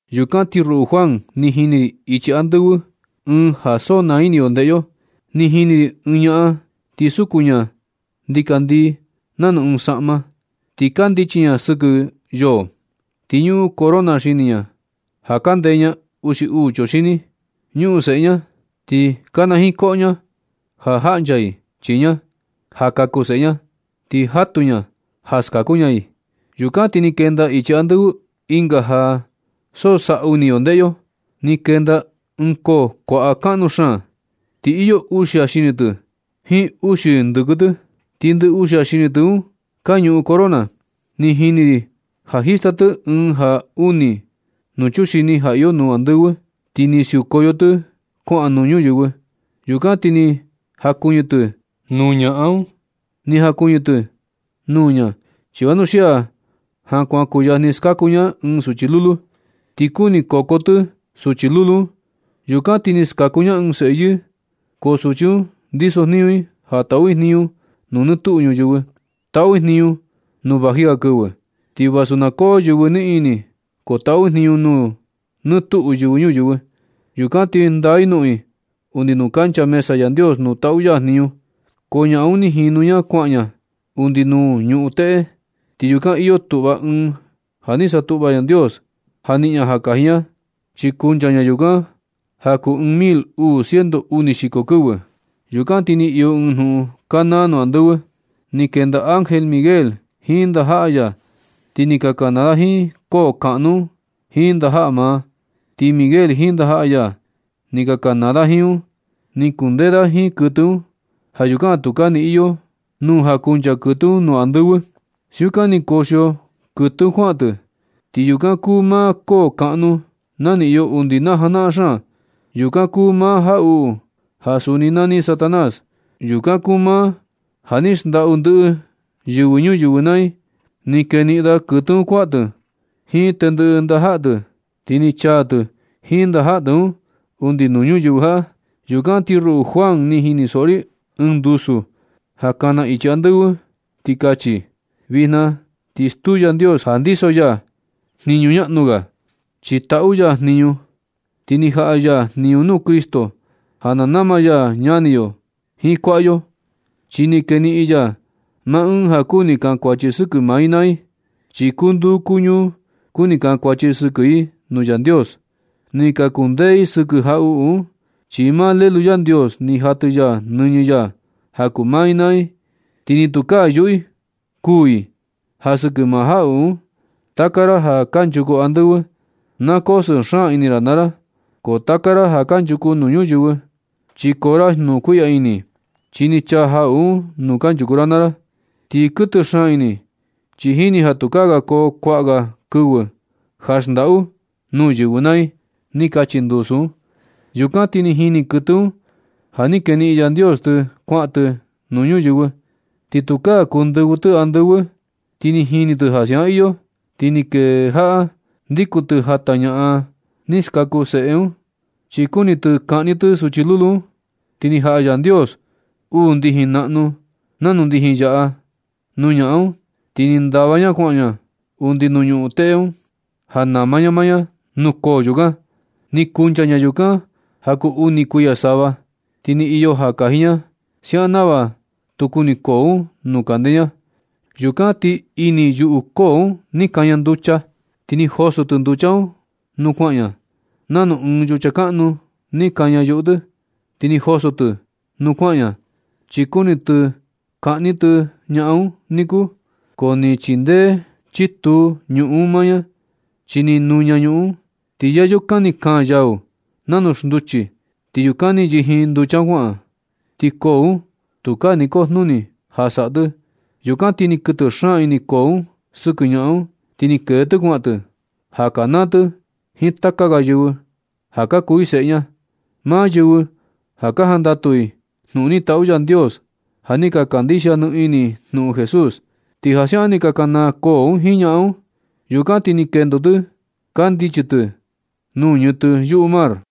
Yukan ti ruꞌu Juan, ni jini ri ichi andɨvɨ ɨɨn ja so naa ini yo ndeꞌe yo. Ni jini ri ɨɨn ñaꞌan, ti suku ña ndikandii nanu ɨɨn saꞌma, ti kandichi ña sɨkɨ yoo. Ti ñuꞌun corona xini ña ja ka ndeña uxi uu chuxini. Ñuꞌun seꞌe ña, ti kanajiin koꞌo ña ja jaꞌncha i chii ña, ja kaku seꞌe ña, ti jatu ña ja skaku ña i. Yukan ti ni kenda ichi andɨvɨ ɨnga ja so saꞌu ii ini ndeꞌe yo nuu. Ni kenda ɨɨn koo kuaꞌa kaꞌnu xaan. Ti iyo uxia xini tɨ jiin uxi ndɨkɨ tɨ, ti ndɨ uxia xini tɨ un ka ñuꞌun corona. Ni jini ri ja jista tɨ ɨɨn ja uni nuu chuxini ja iyo nuu andɨvɨ, ti ni siukoyo tɨ kuaꞌan nuu ñuyɨvɨ. Yukan ti ni jakuɨñɨ tɨ nuu ñaꞌan un. Ni jakuɨñɨ tɨ nuu ña chi vanuxia ja kuan kuyajni skaku ña ɨɨn suchi lulu, ti kuni koko tɨ suchi lulu un. Yukan ti ni skaku ña ɨɨn seꞌe yɨɨ. Ko suchi un ndisojniñu i ja taꞌu i jniñu nuu nɨ tuꞌu ñuyɨvɨ. Taꞌu i jniñu nuu vaji ga kɨvɨ, ti vasu na koo yɨvɨ niꞌin ini, ko taꞌu i jniñu nuu nɨ tuꞌu yɨvɨ ñuyɨvɨ. Yukan ti ndaa i noꞌon i undi nuu kancha mesa Yandios nuu taꞌu ya jniñu. Ko ñaꞌan un ni jinu ña kuaꞌan ña undi nuu ñuꞌun teꞌe. Ti yukan iyo tuꞌva ɨɨn ja ni satuꞌva Yandios ja niꞌin ña ja kaji ña, chi kuncha ña yukan ja kuu ɨɨn mil uu ciento uni xiko kɨvɨ. Yukan ti ni iyo ɨɨn jnuꞌun kanaa nuu andɨvɨ. Ni kenda ángel Miguel jiin ndajaꞌa ya, ti ni ka kanaa da jiin koo kaꞌnu un jiin ndajaꞌa maa. Ti Miguel jiin ndajaꞌa ya, ni ka kanaa da jiin un. Ni kundee da jiin kuɨtɨ un. Ja yukan tukaa ni iyo nuu ja kunchaa kuɨtɨ un nuu andɨvɨ. Siukan ni kuxio kuɨtɨ un kuaꞌan tɨ. Ti yukan kuu maa koo kaꞌnu ja ni iyo undi najanaꞌan xaan. Yukan kuu maa jaꞌuꞌu ja suni nani Satanás. Yukan kuu maa ja ni xndaꞌu ndɨꞌɨ yɨvɨ ñuyɨvɨ naa i. Ni keniꞌin da kuɨtɨ un kuaꞌan tɨ jiin tendɨꞌɨ ndajaꞌa tɨ. Ti ni chaa tɨ jiin ndajaꞌa tɨ un undi nuu ñuyɨvɨ jaꞌa. Yukan ti ruꞌu Juan, ni jinisoꞌo ri ɨɨn ndusu ja kana ichi andɨvɨ, ti kachi: Vijna ti stuu Yandios ja ndiso ya jniñu ñaꞌnu ga. Chi taꞌu ya jniñu, ti ni jaꞌa ya jniñu nuu Cristo ja na nama ya ñani yo jiin kuaꞌa yo. Chi ni keniꞌin ya maa ɨɨn ja kuni kankuachi sɨkɨ maa i naa i. Chi kuu nduu kuu ñuu kuni kankuachi sɨkɨ i nuu Yandios. Ni ka kundee i sɨkɨ jaꞌuꞌu un, chi maa Lelu Yandios ni jatɨ ya nɨñɨ ya ja kuu maa i naa i. Ti ni tukaa yuꞌu i kuū i ja sɨkɨ maa jaꞌuꞌu un. Taka ra ja kanchuku andɨvɨ, na koo sɨɨ xaan ini ra naa ra. Ko taka ra ja kanchuku nuu ñuyɨvɨ, chi koo ra jnukuiꞌya ini, chi ni chaa jaꞌuꞌu un nuu kanchuku ra naa ra. Ti kuɨtɨ xaan ini i, chi jini ja tukaa ga koo kuaꞌa ga kɨvɨ ja xndaꞌu nuu yɨvɨ naa i. Ni kachi ndusu un. Yukan ti ni jini kuɨtɨ un ja ni keniꞌin Yandios tɨ kuaꞌan tɨ nuu ñuyɨvɨ. Ti tukaa kuu ndɨvɨ tɨ andɨvɨ. Ni jini tɨ ja siaꞌan iyo, ti ni kejaꞌa ndikun tɨ jata ñaꞌan ni skaku seꞌe un, chi kuni kaꞌni tɨ suchi lulu un. Ti ni jaꞌa Yandios uu ndijin naꞌnu nanu ndijin yaꞌa nuu ñaꞌan un, ti ni ndava ña kuaꞌan ña undi nuu ñuꞌun teꞌe un, ja nama ña maa ña nuu koo yukan. Ni kuncha ña yukan ja kuu uni kuiya sava, ti ni iyo ja kaji ña, siaꞌan nava tu kuni koo un nuu kande ña. Yukan ti ini yuꞌu koo un ni kaña nducha. Ti ni joso tɨ nducha un nuu kuaꞌan ña. Nanu ɨɨn yucha kaꞌnu ni kaña yuꞌu tɨ ti ni joso tɨ nuu kuaꞌan ña, chi kuni tɨ kaꞌni tɨ ñaꞌan un niku. Ko ni chindee chituu ñuꞌun un maa ña, chi ni nuña ñuꞌun un, ti yayukan ni kaan yau nanu xnduchi, ti yukan ni yijin nducha un kuaꞌan. Ti koo un tukaa ni kujnuni ja saꞌa tɨ. Yukan na ti ni kuɨtɨ xaan ini koo un sɨkɨ ñaꞌan un. Ti ni kee tɨ kuaꞌan tɨ, ja kanaa tɨ jiin taka ga yɨvɨ ja ka kuu i seꞌe ña, maa yɨvɨ ja ka jandatu i jnuꞌun ni taꞌu Yandios, ja ni ka kandixia ni ini i jnuꞌun Jesús. Ti ja siaꞌan ni ka kanaa koo un jiin ñaꞌan un. Yukan ti ni kendo tɨ kandichi tɨ nuu ñɨtɨ yuꞌu mar un.